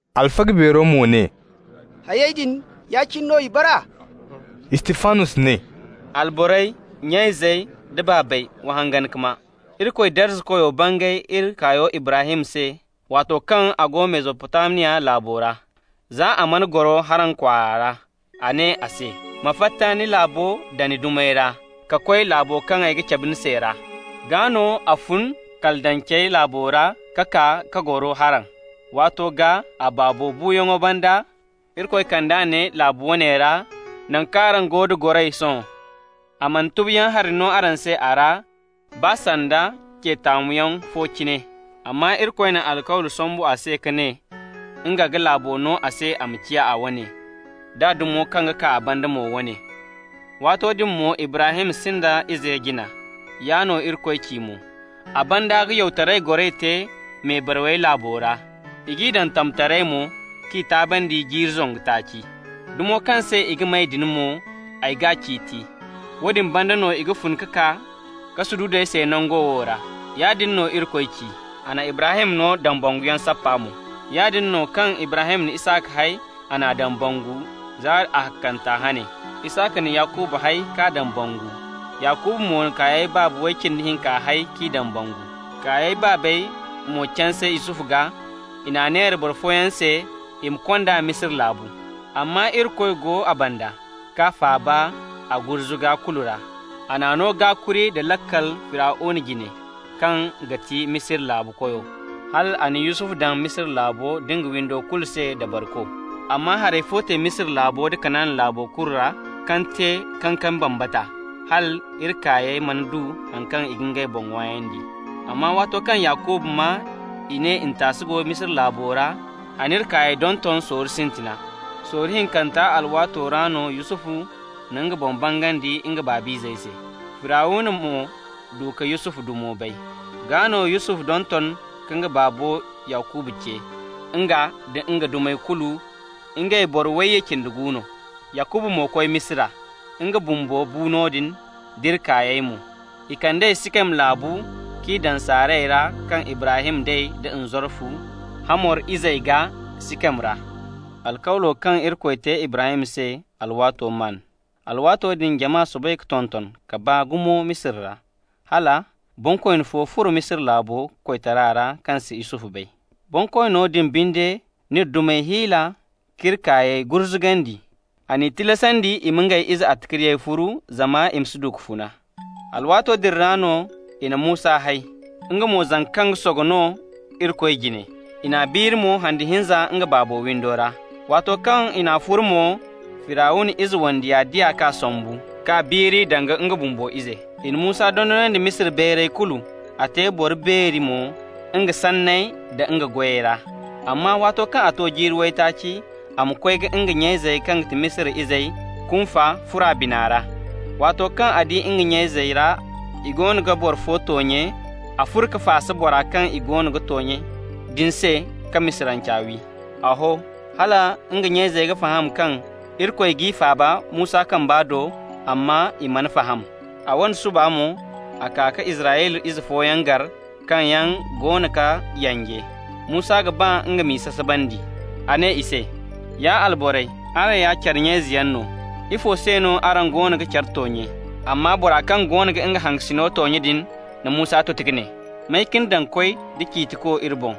Alfaga beero mo ne: «Hayey din, ya-cine no i bara?» Istifanos ne: «Alborey, nya-izey da baabey, wa hangan ka maa: Irikoy Darzakoyo bangay iri kaayo Ibrahim se waato kaŋ a go Mesopotamiya laabo ra, za a mana goro Haran kwaara ra. A ne a se: ‹Ma fatta ni laabo da ni dumey ra, ka koy laabo kaŋ ay ga cabe ni se ra.› Gaa no a fun Kaldancey laabo ra ka kaa ka goro Haran. Waato gaa, a baabo buuyaŋo banda, Irikoy kand'a ne laabu woone ra, naŋ kaŋ araŋ go da goray sohõ. A mana tubuyaŋ hari no a se a ra, baa sanda ce taamuyaŋ fo cine. Amma Irikoy na alkawli sambu a se ka ne nga ga laabo no a se a ma ciya a wane, d'a dumo kaŋ ga kaa a banda mo wane. Waato din mo Ibrahim sinda ize jina. Yaa no Irikoy ci mo: a ‹banda ga yawtaray goray te mebarawey laabo ra. I g'i daŋ tamtaray mo k'i taabandi jiiri zangu taaci. Dumo kaŋ se i ga may din mo, ay g'a ciiti. Woodin banda no i ga fun ka kaa ka sududu ay se nango wo ra.› Yaadin no Irikoy ci. A na Ibrahim no dambanguyaŋ sappa mo. Yaadin no, kaŋ Ibrahim na Isaka hay, a n'a dambangu zaari ahakkanta hane. Isaka na Yakuba hay k'a dambangu, Yakuba mo na kaayey baaba way cindi hinka hay k'i dambangu. Kaayey baabey mo canse Yusufu gaa. I n'a neera boro fooyaŋ se i ma kond'a Misira laabu. Amma Irikoy go a banda k'a faaba a gurzuga kulu ra. A n'a no gaakuri da laakal Firawna jine, kaŋ ga ti Misira laabu koyo, hal a na Yusufu daŋ Misira laabo nda nga windo kulu se dabariko. Amma haray fo te Misira laabo da Kanaana laabo kulu ra, kaŋ te kankami bambata, hal iri kaayey mana du haŋ kaŋ ga ngey boŋ ŋwaayandi. Amma waato kaŋ Yakuba maa i ne ntaasu go Misira laabo ra, a n'iri kaayey donton sorro sintina. Sorro hinkanta alwaato ra no Yusufu na nga boŋ bangandi nga baabayzey se. Firawna mo du ka Yusufu dumo bay. Gaa no Yusufu donton ka nga baabo Yakuba ce, nga da nga dumey kulu, ngey boro wayye cindi gu no. Yakuba mo koy Misira. Nga bumbo bu noodin, d'iri kaayey mo. I kand'ey Sikem laabu k'i daŋ sarayey ra kaŋ Ibrahim day da nzarfu Hamor izey gaa Sikem ra. Alkawlo kaŋ Irikoy te Ibrahim se alwaato maan. Alwaato din jama soobay ka tonton ka baa gumo Misira ra, hala: ‹bonkooni fo furo Misira laabo koytara ra kaŋ si Yusufu bay.› Bonkoono din binde n'iri dumey hiila k'iri kaayey gurzugandi. A n'i tilasandi i ma ngey ize attaciriyey furu, zama i ma si du ka funa. Alwaato din ra no i na Musa hay, nga mo zanka kaŋ ga sogo no Irikoy jine. I n'a biiri mo handu hinza nga baabo windo ra. Waato kaŋ i n'a furu mo, Firawna ize wandiya di a k'a sambu, k'a biiri danga nga bumbo ize. I na Musa dondonandi Misira bayray kulu, a te boro beeri mo nga sanney da nga goyey ra. Amma waato kaŋ a to jiiri waytaaci, a ma koy ka nga nya-izey kaŋ ti Israyla izey kunfa furo a bina ra. Waato kaŋ a di nga nya-izey ra i goono ga boro fo toonye, a furo ka faasa bora kaŋ i goono ga toonye din se ka Misiranca wi. A ho hala nga nya-izey ga faham kaŋ Irikoy g'i faaba Musa kamba do, amma i mana faham. A wane suba mo, a kaa ka Israyla ize fooyaŋ gar kaŋ yaŋ goono ga yanje. Musa ga ba nga m'i sasabandi. A ne i se: ‹Ya alborey, araŋ ya care nya-izeyaŋ no. Ifo se no araŋ goono ga care toonye?› Amma bora kaŋ goono ga nga hangasino toonye din na Musa tuti ka ne: ‹May ka ni daŋ koy da ciitiko iri boŋ?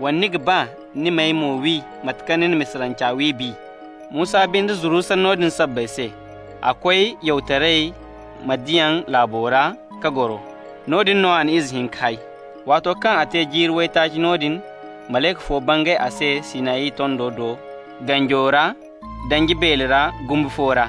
Wala ni ga ba ni ma ay mo wi mate kaŋ ni na Misiranca wi bi?› Musa binde zuru sanno din sabbay se. A koy yawtaray Midiyan laabo ra ka goro. Noodin no a na ize hinka hay. Waato kaŋ a te jiiri waytaaci noodin, malayka fo bangay a se Sinayi tondo do ganjo ra danji beele ra gumbi fo ra.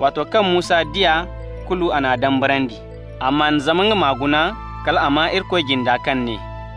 Waato kaŋ Musa di a kulu, a n'a dambarandi. A maan zama nga ma guna, kal a maa Irikoy jinde kaŋ ne: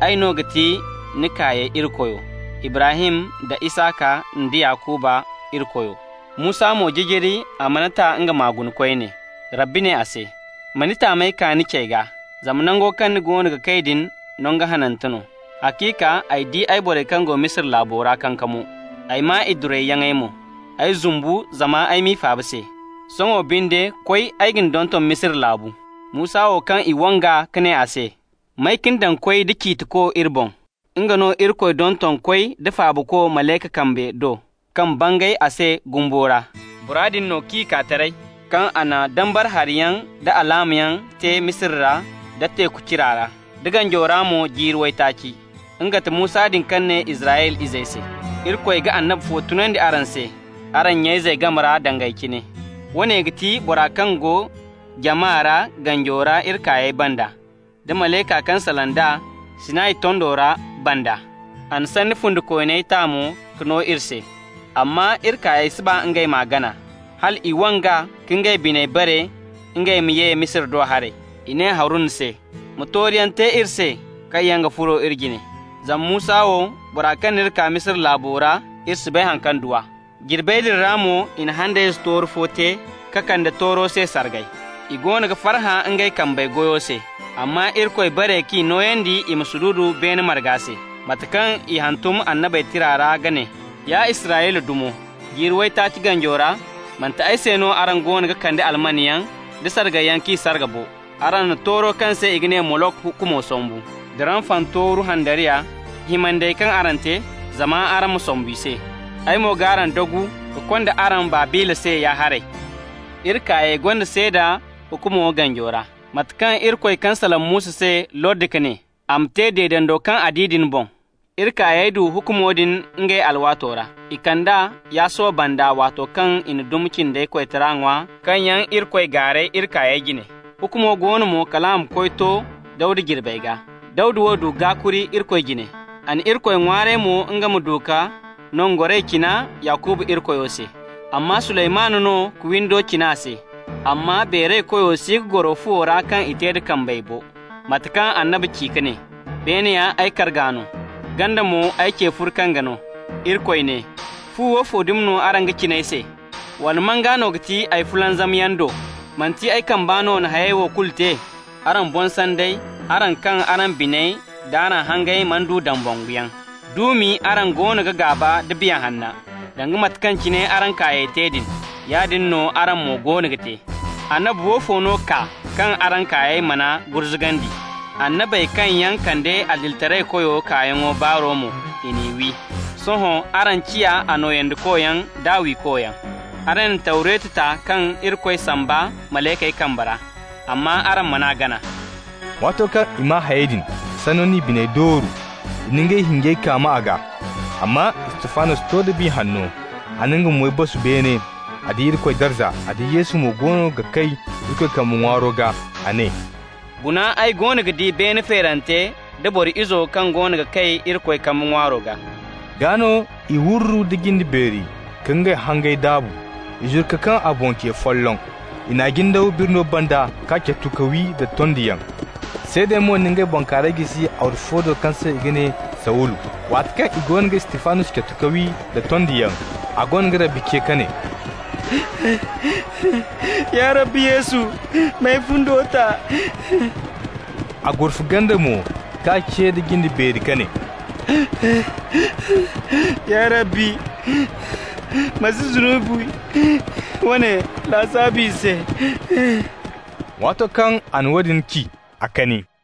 ‹Ay no ga ti ni kaayey Irikoyo, Ibrahim da Isaka nda Yakuba Irikoyo.› Musa mo jijiri, a mana ta nga ma guna koyne. Rabbi ne a se: ‹Ma ni taamey kaa ni cey gaa, zama nango kaŋ ni goono ga kay din, nangu hanante no. Haciika, ay di ay borey kaŋ go Misira laabo ra kankamo, ay maa i durayyaŋey mo. Ay zumbu zama ay m'i faaba se. Sohõ binde koy, ay ga ni donton Misira laabu.› Musa wo, kaŋ i wang'a ka ne a se: ‹May ka ni daŋ koy da ciitiko iri boŋ?›, nga no Irikoy donton koy da faabako Malayka kambe do kaŋ bangay a se gumbo ra. Bora din no k'i kaa taray, kaŋ a na dambara hariyaŋ da alaamayaŋ te Misira ra da Teeku Cira ra, da ganjo ra mo jiiri waytaaci. Nga ga ti Musa din kaŋ ne Israyla izey se: ‹Irikoy ga annabi fo tunandi araŋ se araŋ nya-izey game ra, danga ay cine.› Woone ga ti bora kaŋ go jama ra ganjo ra iri kaayey banda nda malayka kaŋ salaŋ d'a Sinayi tondo ra banda. A na sanni fundikooney ta mo ka no iri se. Amma iri kaayey si ba ngey m'a gana, hal i wang'a ka ngey biney bare ngey ma ye Misira do haray. I ne Haruna se: ‹Ma tooruyaŋ te iri se kaŋ yaŋ ga furo iri jine. Zama Musa wo, bora kaŋ n'iri kaa Misira laabo ra, iri si bay haŋ kaŋ du a.› Jirbey din ra mo i na handayze tooru fo te ka kande tooro se sargay. I goono ga farhã ngey kambey goyo se. Amma Irikoy bare k'i nooyandi i ma sududu beene marga se, mate kaŋ i hantum annabey tira ra ka ne: ‹Ya Israyla dumo, jiiri waytaaci ganjo ra, manti ay se no araŋ goono ga kande almanyaŋ da sargayyaŋ k'i sarga bo. Araŋ na tooro kaŋ se i ga ne Molok hukumo sambu, da Ramfan tooru handariya, himandi-himandey kaŋ araŋ te zama araŋ ma sombu i se. Ay mo g'araŋ dagu ka konda araŋ Babila se ya-haray.› Iri kaayey gonda seeda hukumo ganjo ra, mate kaŋ Irikoy kaŋ salaŋ Musa se lordi ka ne a m'a te deedando kaŋ a di din boŋ. Iri kaayey du hukumo din ngey alwaato ra. I kand'a Yasuwa banda waato kaŋ i na dumi cindey koytaray ŋwa kaŋ yaŋ Irikoy gaaray iri kaayey jine. Hukumo go no mo kal a ma koy to Dawda jirbey gaa. Dawda wo du gaakuri Irikoy jine. A na Irikoy ŋwaaray mo nga ma du ka nangoray cina Yakuba Irikoyo se. Amma Suleymanu no ka windo cina a se. Amma Beeraykoyo si ga goro fuwey ra kaŋ i te da kambey bo, mate kaŋ annabi ci ka ne: ‹Beene ya ay karga no, ganda mo ay ce furkange no.› Irikoy ne: ‹Fu woofo dumi no araŋ ga cina ay se? Wala man gaa no ga ti ay fulanzamyaŋ do? Manti ay kamba no na hayey wo kulu te?› Araŋ boŋ sandey, araŋ kaŋ araŋ biney d'araŋ hangey mana du dambanguyaŋ, duumi araŋ goono ga gaaba nda Biya Hanna. Danga mate kaŋ cine araŋ kaayey te din, yaadin no araŋ mo goono ga te. Annabi woofo no kaa kaŋ araŋ kaayey man'a gurzugandi? Annabey kaŋ yaŋ kande Adilitaraykoyo kaayaŋo baaro mo, i n'i wi. Sohõ araŋ ciya a nooyandikoyaŋ d'a wiikoyaŋ. Araŋ na Tawretu ta kaŋ Irikoy samba malaykey kambe ra, amma araŋ man'a gana.» Waato kaŋ i maa hayey din, sanno n'i biney dooru. I na ngey hinjey kaama a gaa. Amma Istifanos to da Biya Hanno. A na nga moy basu beene, a di Irikoy darza, a di Yesu mo goono ga kay Irikoy kambe ŋwaaro gaa. A ne: «Guna! Ay goono ga di beena feerante da Boro Izo kaŋ goono ga kay Irikoy kambe ŋwaaro gaa.» Gaa no i wurru da jinde beeri ka ngey hangey daabu. I zuru ka kaŋ a boŋ ce folloŋ. I n'a jindaw birno banda, k'a catu ka wi da tondiyaŋ. Seedey mo na ngey bankaarayey jisi arwasu fo do kaŋ se i ga ne Sawulu. Waati kaŋ i goono ga Istifanos catu ka wi da tondiyaŋ, a goono ga Rabbi ce ka ne: «Ya Rabbi Yesu, m'ay fundo ta.» A gurfa ganda mo ka ce da jinde beeri ka ne: «Ya Rabbi, ma si zunubi woone lasaabu i se.» Waato kaŋ a na woodin ci, a kani.